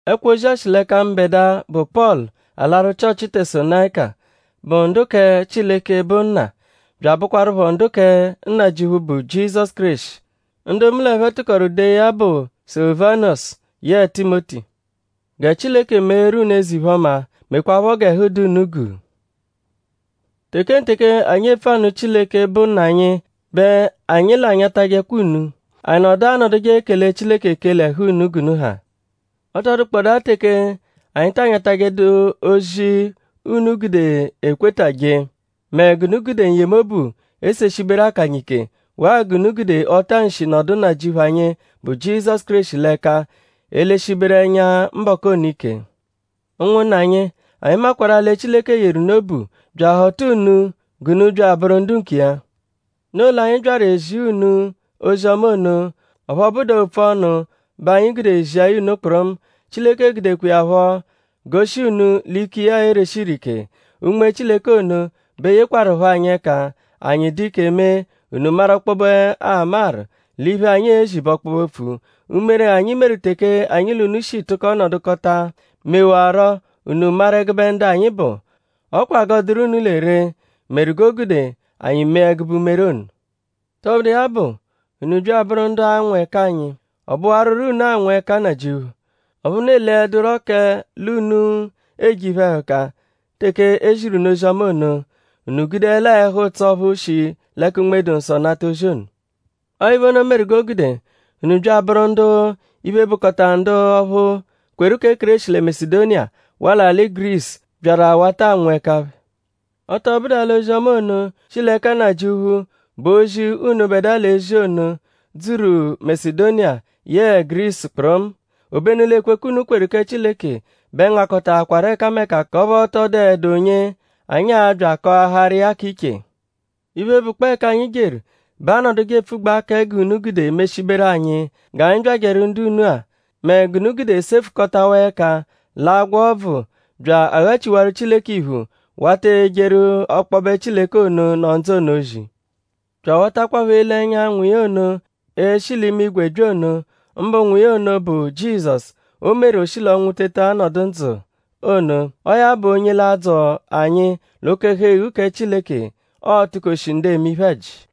Ẹkwo-ozi-a shi l'ẹka mbẹdua, bụ Pọlu alaru Chịochi Tesalonayika, bụ ndu kẹ Chileke, bụ Nna; bya abụkwarupho ndu kẹ Nnajịuphu, bụ Jizọsu Kéreshi. Ndu mu ẹphe tụkoru dee ya bụ Sulivanusu yẹe Timoti. Gẹ Chileke meeru unu eze-iphe-ọma; mekwaaphọ g'ẹhu dụ unu guu. Tekenteke, anyi epfu anụ Chileke, bụ Nna anyi bẹ anyi l'anyatajẹkwa unu. Anyi nọdu anọduje ekele Chileke ekele ẹhu unu g'unu ha. Ọ tọ dụkpodaa teke anyi ta anyatajẹdu ozi unu gude ekweta jee; mẹ g'unu gude n-yemobu eseshiberu akanya ike; waa g'unu gude ọta-nshi nọdu Nnajịuphu anyi, bụ Jizọsu Kéreshi l'ẹka eleshiberu ẹnya mbọku ono ike. Ụnwunna anyi; anyi makwarụ-a lẹ Chileke yeru unu obu; bya ahọta unu g'unu bya abụru ndu nkiya. Noo l'anyi byaru ezia unu ozi-ọma ono; ọphu ọ bụdu-a opfu ọnu bẹ anyi gude zia ya unu kpụrumu; Chileke gudekwa iya phọ goshi unu l'ike iya ereshi ire ike. Unme Chileke ono bẹ yekwarụpho anyi ẹka; anyi dụ ike mee; unu maru ọkpobe amaru l'iphe anyi ezi bụ ọkpobe-opfu. Umere, anyi meru teke anyi l'unu shi tụko nọdukota mewarurọ unu maru ẹgube ndu anyi bụ. Ọ kwa g'ọo-dụru unu lẹ ree meru g'o gude anyi mee ẹgube umere ono. Tọbudu iya bụ; unu bya abụru ndu anwụ ẹka anyi. Ọ bụwaruro unu anwụ ẹka Nnajịuphu. Ọphu unu eledurọ kẹ l'unu eje iphe-ẹhuka teke e ziru unu ozi-ọma ono; unu gudelaa ẹhu-ụtso ọphu shi l'ẹka Unme-dụ-Nsọ nata ozi ono. Ọo iphe ono meru g'o gude unu bya abụru ndu iphe, bụkota ndu ọphu, kweru kẹ Kéreshi lẹ Masedoniya waa l'alị Gurisu byaru awata anwụ ẹka phẹ. Ọ tọ bụdu-a l'ozi-ọma ono, shi l'ẹka Nnajịuphu, bụ ozi, unubẹdua l'ezi ono dzuru Masedoniya yẹe Gurisu kpụrumu; obenu l'ekwekwe, unu kweru kẹ Chileke bẹ ngakọtaakwaru ẹkameka k'ọphu ọ tọ dụedu onye anyi a-bya akọaharu iya k'iche. Iphe, bụkpoo ẹka anyi jeru bẹ aanọduje epfugbaa kẹ g'unu gude meshiberu anyi g'anyi byajẹru ndu unu-a; mẹ g'unu gude sefukọtawaa ẹka l'agwa ọbvu bya aghachiwaru Chileke iphu; wata ejeru ọkpobe Chileke ono, nọ ndzụ ono ozi; bya awatakwaphọ ele ẹnya Nwa iya ono, e-shi l'imigwe bya ono; mbụ Nwa iya ono bụ Jizọsu, o meru o shi l'ọnwu teta nọdu ndzụ ono. Ọo ya bụ onye l'a-dzọ anyi l'oke-ẹhu-eghu kẹ Chileke, ọ-tukoshi ndu eme iphe-ẹji.